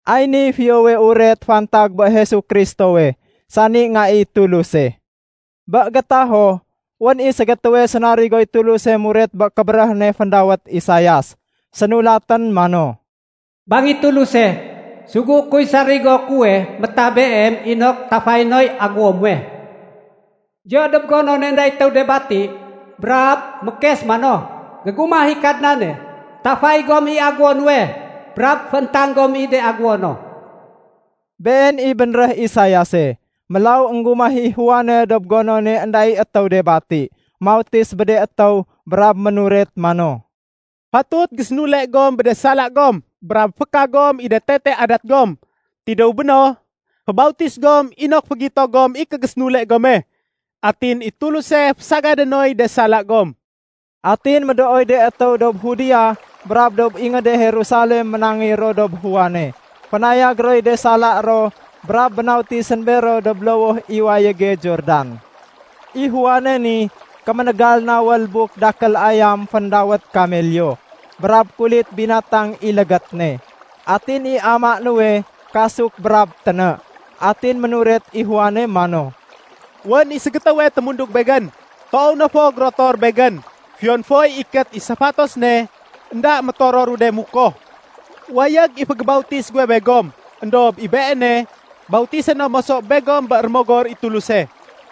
Ay niy Fiyowe Uret fantag bé Jesu Kristowe, sani Nga i Tuluse. Bé gétaho, wén i ségétéwe sénarigoy Tuluse muret bé kébéréh ne féndawét Isaias. Sénulatén mano, “Bang i Tuluse, ‘Sugué kuy sarigo kuwe métah Beem inok tafayé noy aguwo muwe.’ Diyo dob gonone énda i étéw de bati, brab mékes mano, ‘Gégumah i Kadnane! Tafay gom i aguwo nuwe, brab fééntang gom i de aguwo no.’” Been i bénréh Isaiase. Mélaw énggumah i Juane dob gonone énda i étéw de bati. Mautis bé de étéw brab ménuret mano, “Fatut gom gésénule bé de sala gom brab féka gom i de tete adat gom. Tidéw béno, fébautis gom inok fégito gom i kégésénule gome. Atin, i Tuluse fésagadé noy de sala gom.” Atin médooy de étéw dob Judea brab dob ingéde Jerusalem ménangéy ro dob Juane. Fénayag roy de sala ro brab bénautisén bero dob lowoh i wayége Jordan. I Juane ni kéménégal nawél buk dakél ayam féndawét kamelyo, brab kulit binatang i légét ne. Atin i amaé nuwe kasuk brab téné. Atin ménuret i Juane mano, “Wén i ségétéwe témundug begén. Toow na fo gérotor begén. Fiyon foy ikét i safatos ne, énda métororu de mukoh. Wayég i fégébautis guwe begom, éndob i Beene, bautisé no moso begom bé Rémogor i Tuluse.”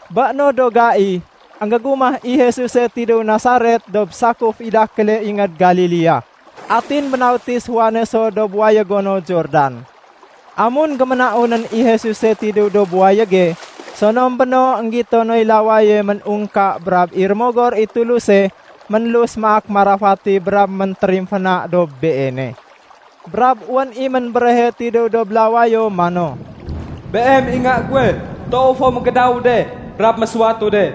Bé no do gai, énggégumah i Jesuse tidéw dob Nasaret dob sakuf i dakéle ingéd Galilea. Atin bénautis Juane so dob wayégo no Jordan. Amun géménaunén i Jesuse tidéw dob wayége, sonom béno énggito noy lawaye ménungka brab i Rémogor i Tuluse ménlus maak marafati brab méntérimféna dob Beene. Brab wén i ménbéréhe tidéw dob lawayo mano, “Beem i Nga guwe. Toow fo mégédawu de brab mésuwatu de.”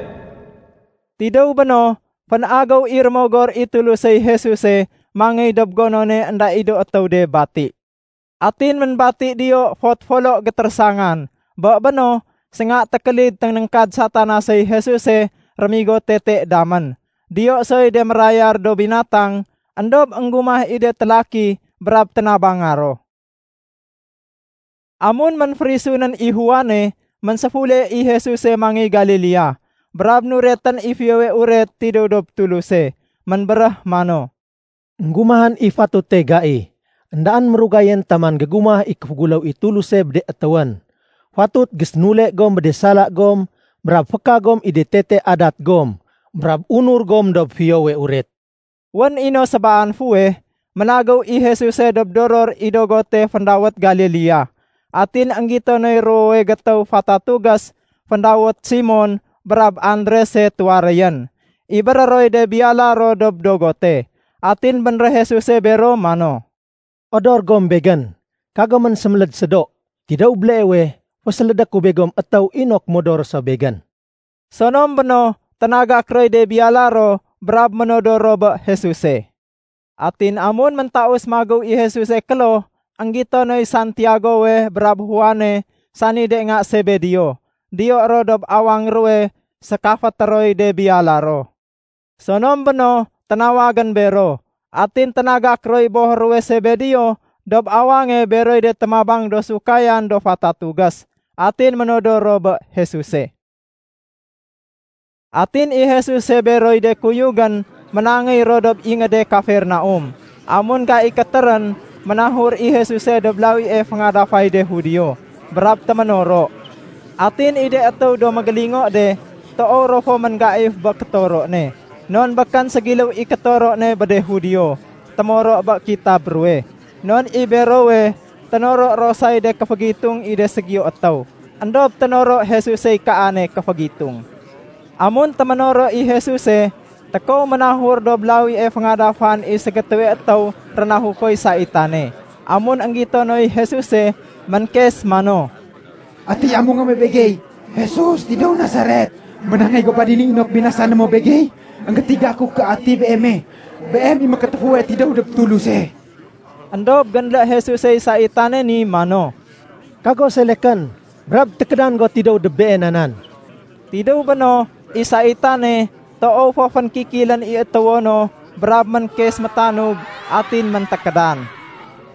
Tidéw béno, fénagéw i Rémogor i Tulusey Jesuse mangéy dob gonone énda i do étéw de bati. Atin ménbati diyo fot folo gétérésangan. Bé béno, sénga tékélid ténéngkad Satanasey Jesuse rémigo tete damén. Diyo soy de mérayar do binatang, éndob énggumah i de télaki brab ténabanga ro. Amun ménférisunén i Juane, ménséfule i Jesuse mangéy Galilea, brab nuretén i Fiyowe Uret tidéw dob Tuluse. Ménbéréh mano, “Enggumahén i fatute gai. Endaén mérugayén taman gégumah i kéféguléw i Tuluse bé de étéwén. Fatut gésénule gom bé de sala gom brab féka gom i de tete adat gom, brab unur gom dob Fiyowe Uret.” Wén i no sébaan fuweh ménagéw i Jesuse dob doror i dogote féndawét Galilea. Atin énggito noy ruwowe gétéw fatatugés féndawét Simon brab Andrese tuwaréyén. Ibéré roy de biyala ro dob dogote. Atin béréh Jesuse bero mano, “Odor gom Begén. Kagomén séméléd sédo. Tidéw béleewe, fésélédé ku begom étéw inok modor ro so Begén.” Sonom béno, ténagak roy de biyala ro brab ménodor ro bé Jesuse. Atin amun méntaus magéw i Jesuse kloh, énggito noy Santiagowe brab Juane sani de nga Sebedeo. Diyo ro dob awang ruwe sékafété roy de biyala ro. Sonom béno, ténawagén bero. Atin ténagak roy boh ruwe Sebedeo dob awange beroy de témabang do sukayan do fatatugés, atin ménodor ro bé Jesuse. Atin i Jesuse beroy de kuyugén ménangéy ro dob ingéde Kafernaum. Amun gai kétérén, ménahur i Jesuse dob lawie féngadafay de Judio, brab téménoro. Atin i de étéw do mégélingo de, toow ro fo ménggaif bé kétoro ne. Non békén ségiléw i kétoro ne bé de Judio témoro bé kitab ruwe. Non i berowe, ténoro ro say de kéfégitung i de ségiyo étéw. Endob ténoro Jesusey kaane kéfégitung. Amun téménoro i Jesuse, tékow ménahur dob lawie féngadafan i ségétéwe étéw rénahukoy saitane. Amun énggito noy Jesuse, ménkes mano, “Ati amungé muwe begey, Jesus tidéw Nasaret? Ménangéy go ba dini inok binasané mo begey? Enggétiga ku ké ati Beeme. Beem i Mékétéfuwe tidéw dob Tuluse.” Endob génlé Jesusey saitane ni mano, “Kago selekén, brab tékédan go tidéw dob beena nan!” Tidéw béno, i saitane, toow fo fénkikilén i étéwo no brab ménkes métanug, atin méntékédan.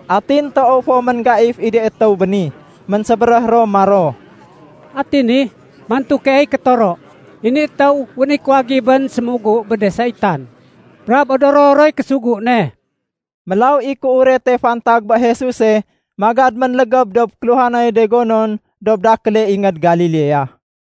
Atin toow fo ménggaif i de étéw bé ni. Ménsébéréh ro maro, “Ati ni? Mantu keey kétoro. I ni étéw wén i kuwagibén sémugu bé de saitan, brab odoro roy késugu ne!” Mélaw i kéurete fantag bé Jesuse magad ménlégéb dob kéluhanay de gonon dob dakéle ingéd Galilea.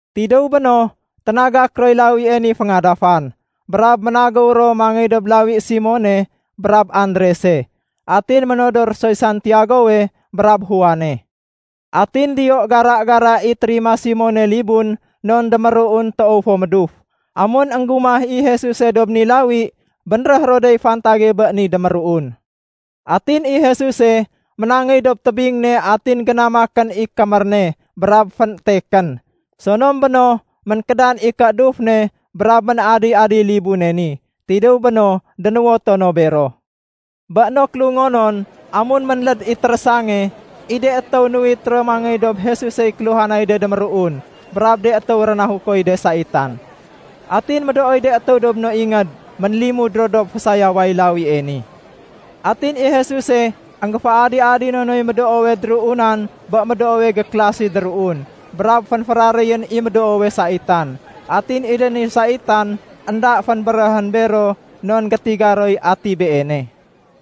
Tidéw béno, ténagak roy lawie ni féngadafan, brab ménagéw ro mangéy dob lawi Simone brab Andrese. Atin ménodor soy Santiagowe brab Juane. Atin diyo gara-gara i térima Simone libun non déméruun toow fo méduf. Amun énggumah i Jesuse dob ni lawi, bénréh ro dey fantage bé ni déméruun. Atin i Jesuse ménangéy dob tébing ne atin génamakén i kémér ne brab fénétekén. Sonom béno, ménkédan i kééduf ne brab ménadi-adiy libune ni. Tidéw béno, dénuwoto no bero. Bé no kélungonon, amun ménléd i térésange, i de étéw nuwit ro mangéy dob Jesusey kéluhanay de déméruun brab de étéw rénahukoy de saitan. Atin médooy de étéw dob no ingéd ménlimud ro dob fésayaway lawie ni. Atin i Jesuse énggéféadi-adino noy médoowe déruunan bé médoowe gékélasi déruun, brab fénféraréyén i médoowe saitan. Atin i de ni saitan, énda fénbéréhén bero non gétiga roy ati Beene.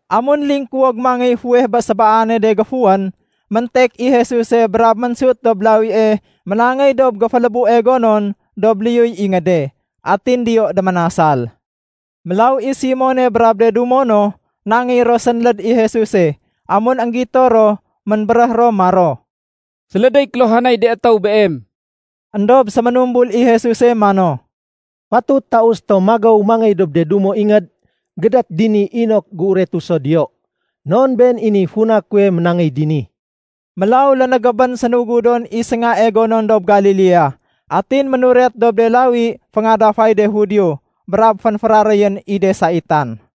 Amun lingkuwog mangéy fuweh bé sébaane de géfuwén, méntek i Jesuse brab ménsut dob lawie ménangéy dob géfélébue gonon dob liyuy ingéde. Atin diyo déménasal. Mélaw i Simone brab de dumo no, nangéy ro sénléd i Jesuse. Amun énggito ro, ménbéréh ro maro, “Sélédéy kéluhanay de étéw Beem.” Endob séménumbul i Jesuse mano, “Fatut taus tom magéw mangéy dob de dumo ingéd gédét dini inok géuretu so diyo, non been i niy funa kuwe ménangéy dini.” Mélaw lénégébén sénugudon i séngae gonon dob Galilea. Atin ménuret dob de lawi féngadafay de Judio, brab fénféraréyén i de saitan.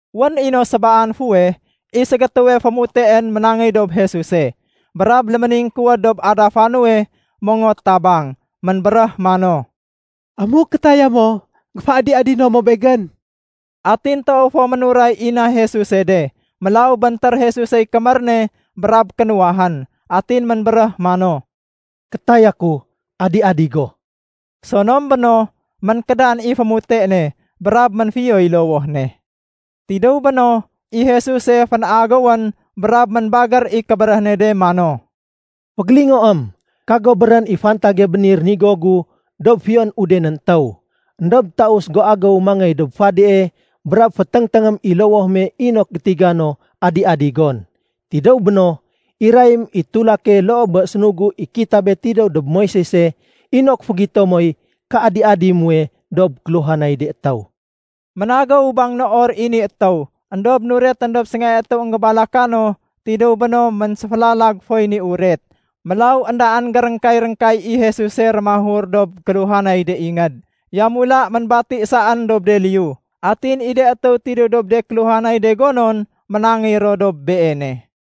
Wén i no sébaan fuweh, i ségétéwe fémuteén ménangéy dob Jesuse, brab léméningkuwéd dob adafa nuwe mongot tabang. Ménbéréh mano, “Amuk kétaya mo, géféadi-adino mo begén.” Atin toow fo ménuray i na Jesuse de. Mélaw béntér Jesusey kémér ne brab kénuwahén. Atin ménbéréh mano, “Kétaya ku. Adi-adi go.” Sonom béno, ménkédan i fémute ne, brab ménfiyoy lowoh ne. Tidéw béno, i Jesuse fénagéwén brab ménbagér i kébéréh ne de mano, “Fégélingoém, kago béréhén i fantage bé ni rénigo gu dob fiyon udenén étéw. Endob taus go agéw mangéy dob fadie brab féténgténgém i lowoh me inok gétiga no adi-adi gon. Tidéw béno, irayém i tulake loo bé sénugu i kitabe tidéw dob Moisese inok fégito moy kéadi-adi muwe dob kéluhanay de étéw.” Ménagéw bangnoor i ni étéw, éndob nuretén dob séngae étéw énggébalaka no, tidéw béno ménséfélalag foy ni uret. Mélaw éndaén géréngkay-réngkay i Jesuse rémahur dob kéluhanay de ingéd. Yamula ménbati saén dob de liyu. Atin i de étéw tidéw dob de kéluhanay de gonon ménangéy ro dob Beene.